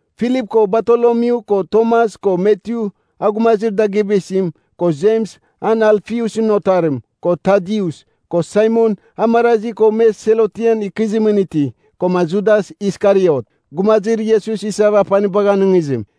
Filip ko Bartolomyu ko Tomas ko Matyu, a gumazir dagɨaba isim, ko Jems, an Alfiusɨn otarim, ko Tadius, ko Saimon, a marazi ko me Selotɨn ikɨzimɨn iti, koma Judas Iskariot, gumazir Iesus isava, apanibagh anɨngizim.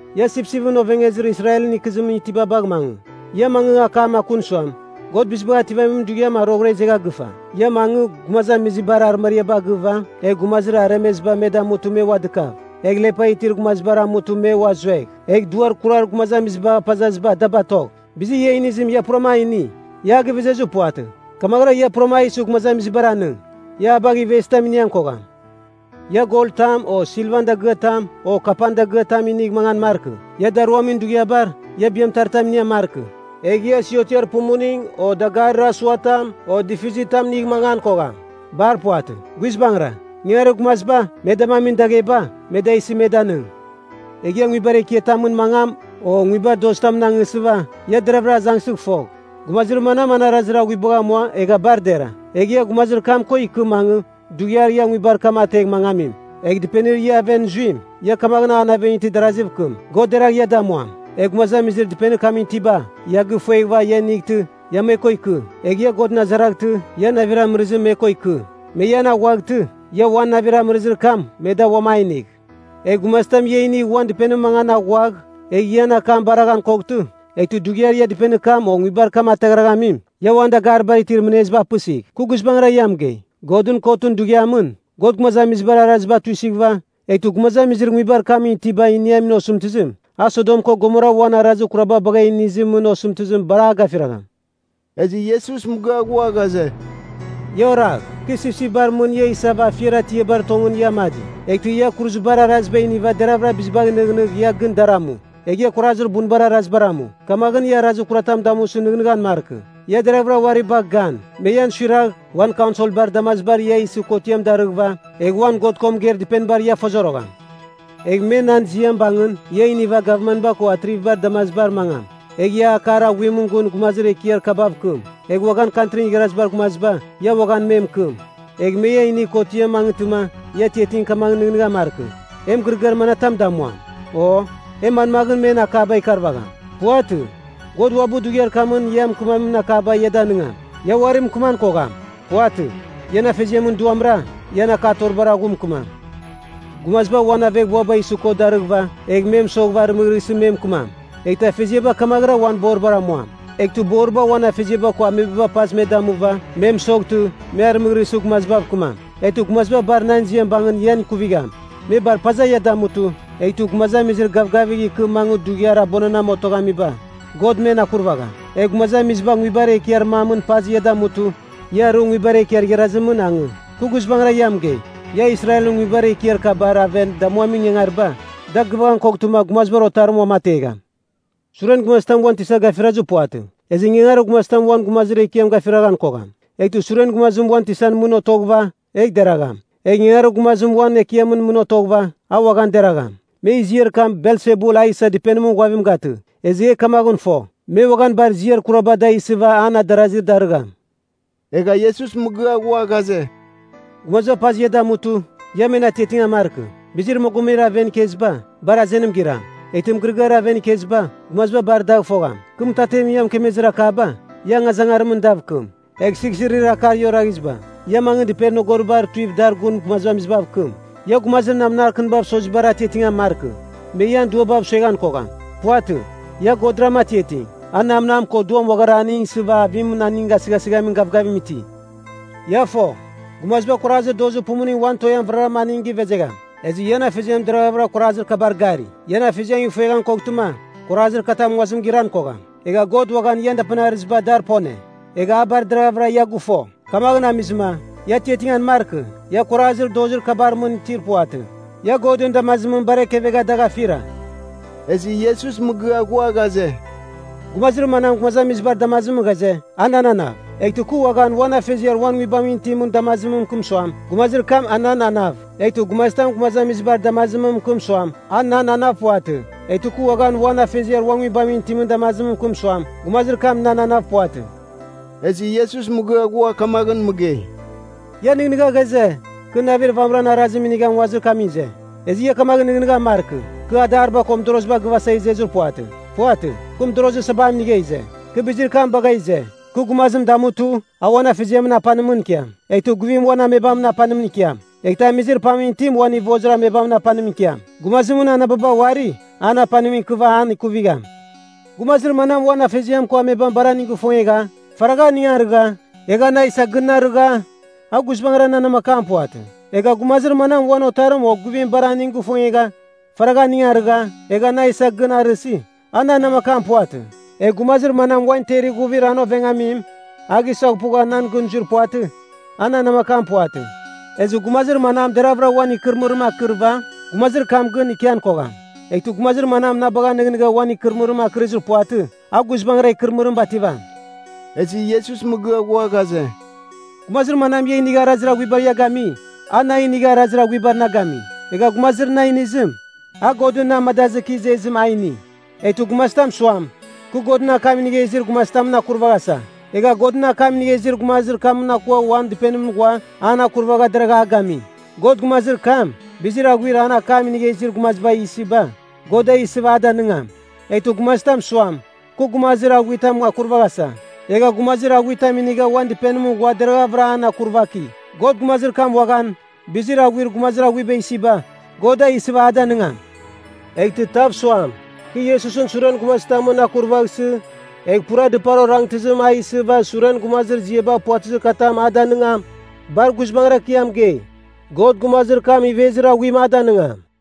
Ia sipsipɨn ovengezir Israelɨn ikɨzimɨn itiba bagh mangɨ. Ia mangɨ, akam akun suam, ‘God Bizibagh Ativamin Dughiam a roghɨra izegha gɨfa.’ Ia mangɨ gumazamizibar arɨmariaba agɨva; egh gumazir aremeziba me damutɨ me ua dɨkav, egh lepa itir gumazibar amutɨ me ua zuegh, egh duar kurar gumazamizibagh apazaziba da batogh. Bizir ia inizim ia purama a ini, ia a gɨvezezir puvatɨ. Kamaghɨra ia pura a isɨ gumazamizibar anɨng. Ia a bagh ivezitam inian kogham. “Ia gol tam o silvan dagɨatam o kapan dagɨatam inigh mangan markɨ. Ia daruamin dughiabar, ia biamɨtaritam inian markɨ. Egh ia siotiar pumuning, o dagarir asuatam o difizitam inigh mangan kogham. Bar puvatɨ. Guizbangɨra, ingangarir gumaziba, me damamin dagheba, me da isɨ me danɨng. “Egh ia nguibar ekiatamɨn mangam, o nguibar dozitamɨn angsɨva, ia deraghvɨra azangsɨgh fogh, gumazir manam an arazir aghuibagh amua egha bar dera. Egh ia gumazir kam ko ikɨ mangɨ, dughiar ia nguibar kam ategh mangamim. Egh dɨpenir ia aven zuim, ia kamaghɨn an aven itir daraziv kɨm, ‘God deragh ia damuam.’ Egh gumazamizir dɨpenir kamɨn itiba, ia gifueghɨva ia inightɨ, ia me ko ikɨ, egh ia Godɨn azaraghtɨ, ian navir amɨrɨzim me ko ikɨ. Me ian aghuaghtɨ, ia uan navir amɨrɨzir kam me da uam a inigh. Egh gumazitam ia inigh uan dɨpenimɨn mangan aghuagh, egh ian akam baraghan koghtɨ, eghtɨ dughiar ia dɨpenir kam o nguibar kam ataghraghamim, ia uan dagaribar itir mɨneziba apɨsigh. Kɨ guizbangɨra ia mɨgei, Godɨn Kotɨn Dughiamɨn, God gumazamizibar arazir kuraba tuisɨghɨva, eghtɨ gumazamizir nguibar kamɨn itiba iniamin osɨmtɨzim, a Sodom ko Gomora uan arazir kuraba bagh inizimɨn osɨmtɨzim bar a gafiragham.” Ezɨ Iesus mɨgɨa ghua ghaze, “Ia oragh, kɨ sipsipbar mɨn ia isava afiar atiabar tongɨn ia amadi. Eghtɨ ia kuruzibar araziba iniva deravɨra bizibagh nɨghnɨgh ia gɨn dar amu. Egh ia kuarazir bunbabar arazibar amu, kamaghɨn ia arazir kuratam damusɨ nɨghnɨghan markɨ. Ia deraghvɨra uari bagh gan. Me ian suiragh, uan kaunselbar damazibar ia isɨ kotiam darɨghɨva, egh uan God ko mɨgeir dɨpenibar ia fozorogham. Egh me nan ziam bangɨn, ia iniva gavmanba ko atrivibar damazibar mangam. Egh ia akar aghuimɨn gun gumazir ekiar kabav kɨm. Egh uaghan Kantrin Igharazibar Gumaziba, ia uaghan me mɨkɨm. Egh me ia inigh kotiamɨn mangɨtɨma ia atiating kamaghɨn nɨghnɨghan markɨ, ‘E mɨgɨrɨgɨar manatam damuam? O, e manmaghɨn men akaba ikarvagham?’ Puvatɨ. God uabɨ dughiar kamɨn ia mɨkɨmamin akaba ia danɨngam. Ia uari mɨkɨman kogham, puvatɨ. Ian Afeziamɨn Duamra, ian akatoribar aghu mɨkɨmam. “Gumaziba uan aveghbuaba isɨ kot darɨghɨva, egh me mɨsoghɨva arɨmɨghrɨsɨ me mɨkɨmam. Eghtɨ afeziaba kamaghɨra uan boribar amuam. Eghtɨ boriba uan afeziaba ko amebaba pazɨ me damuva, me mɨsoghtɨ, me arɨmɨghrɨsɨ, gumazibav kɨmam. Eghtɨ gumaziba bar nan ziam bangɨn ian ikuvigham. Me bar paza ia damutɨ, eghtɨ gumazamizir gavgavigh ikɨ mangɨ dughiar abuananamɨn otoghamiba, God men akurvagham. Egh gumazamiziba nguibar ekiar mamɨn pazɨ ia damutɨ, ia arɨ nguibar ekiar igharazimɨn angɨ. Kɨ guizbangɨra ia mɨgei, ia Israelɨn nguibar ekiar kabar aven damuamin ingangariba, da gɨvaghan koghtɨma Gumazibar Otarim uamategham. “Suren gumazitam uan tisa gafirazir puvatɨ, ezɨ ingangarir gumazitam uan gumazir ekiam gafiraghan kogham. Eghtɨ suren gumazim uan tisan mɨn otoghɨva, egh deragham. Egh ingangarir gumazim uan ekiamɨn mɨn otoghɨva, a uaghan deragham. Me ziar kam Belsebul a isa dɨpenimɨn ghuavim gatɨ, ezɨ e kamaghɨn fo, me uaghan bar ziar kuraba da isɨva an adarazi darɨgham.” Egha Iesus mɨgɨa ghua ghaze, “Gumaziba pazɨ ia damutɨ, ia men atiatingan markɨ. Bizir mogomebar aven ikeziba, bar azenim giram. Eghtɨ mɨgɨrɨgɨar aven ikeziba, gumaziba bar dagh fogham. Kɨ mɨtatemɨn ia mɨkemezir akaba, ia angazangarimɨn dav kɨm. Egh sighsirir akar ia oraghiziba, ia mangɨ dɨpenir nogoribar tuiv dar gun gumazamizibav kɨm. Ia gumazir namnar kɨnibav sozibar atiatingan markɨ. Me ian duabav sueghan kogham. Puvatɨ. Ia Godram atiating. A namnam ko duam uaghara aning isɨva avimɨn aning gasɨghasɨghamin gavgavim iti. Ia fo, gumaziba kuarazir dozir pumuning wan toean vɨrara aning givezegham. Ezɨ ian Afeziam deraghavɨra kuarazir kabar gari. Ian Afeziam ifueghan koghtɨma, kuarazir katam nguazim giran kogham. Egha God uaghan ian dapanir arɨziba dar pone, egha a bar deraghavɨra ia gɨfo. Kamaghɨn amizɨma, ia atiatingan markɨ. Ia kuarazir dozir kabar mɨn itir puvatɨ. Ia Godɨn damazimɨn bar ekevegha dagh afira.” Ezɨ Iesus mɨgɨa ghua ghaze, “Gumazir manam gumazamizibar damazimɨn ghaze, a nan anav, eghtɨ kɨ uaghan uan Afeziar uan Nguibamɨn itimɨn damazimɨn mɨkɨm suam, gumazir kam a nan anav. Eghtɨ gumazitam gumazamizibar damazimɨn mɨkɨm suam, a nan anav puvatɨ, eghtɨ kɨ uaghan uan Afeziar uan Nguibamɨn itimɨn damazimɨn mɨkɨm suam, gumazir kam nan anav puvatɨ.” Ezɨ Iesus mɨgɨa ghua kamaghɨn mɨgei, “Ia nɨghnɨgha ghaze, kɨ navir vamɨran arazim inigha, nguazir kamɨn ize. Ezɨ ia kamaghɨn nɨghnɨghan markɨ. Kɨ adariba ko mɨdoroziba gɨvasa izezir puvatɨ. Puvatɨ. Kɨ mɨdorozir sabam inigha ize. Kɨ bizir kam bagha ize, kɨ gumazim damutɨ, a uan afeziamɨn apanimɨn ikiam. Eghtɨ guivim uan amebamɨn apanimɨn ikiam, eghtɨ amizir pamɨn itim uan ivozir amebamɨn apanimɨn ikiam. Gumazimɨn anababa uari, an apanim ikɨva, an ikuvigham. “Gumazir manam uan afeziam ko amebam bar aning gifongegha, faragha aning arɨgha, egha na isa gɨn arɨgha, a guizbangɨra nan namakam puvatɨ. Egha gumazir manam uan otarim o guivim bar aning gifongegha, faragha aning arɨgha, egha na isa gɨn arɨsi, a nan namakam puvatɨ. Egh gumazir manam uan ter ighuvir an ovengamim a gisaghpugha nan gɨn zuir puvatɨ, a nan namakam puvatɨ. Ezɨ gumazir manam deravɨra uan ikɨrɨmɨrim anekɨriva, gumazir kam gɨn ikian kogham. Eghtɨ gumazir manam na bagha nɨghnɨgha uan ikɨrɨmɨrim akɨrizir puvatɨ, a guizbangɨra ikɨrɨmɨrim bativam.” Ezɨ Iesus mɨgɨa ghua ghaze, “Gumazir manam ia inigha arazir aghuibar ia gami, a na inigha arazir aghuibar na gami. Egha gumazir na inizim, a Godɨn na amadazɨ kɨ izezim a ini. Eghtɨ gumazitam suam, kɨ Godɨn akam inigha izir gumazitamɨn akurvaghasa, egha Godɨn akam inigha izir gumazir kamɨn akua uan dɨpenimɨn ghua an akurvagha deragha a gami, God gumazir kam, bizir aghuir an akam inigha izir gumaziba isiba, God da isɨva a danɨngam. Eghtɨ gumazitam suam, kɨ gumazir aghuitamɨn akurvaghasa, egha gumazir aghuitam inigha uan dɨpenimɨn ghua deraghavɨra an akurvaki, God gumazir kam uaghan, bizir aghuir gumazir aghuiba isiba, God da isɨva a danɨngam. Eghtɨ tav suam, kɨ Iesusɨn suren gumazitamɨn akurvaghsɨ, egh pura dɨpar orangtɨzim a isɨva suren gumazir ziaba puvatɨzir katam a danigam, bar guizbangɨra kɨ ia mɨgei, God gumazir kam ivezir aghuim a danɨngam.”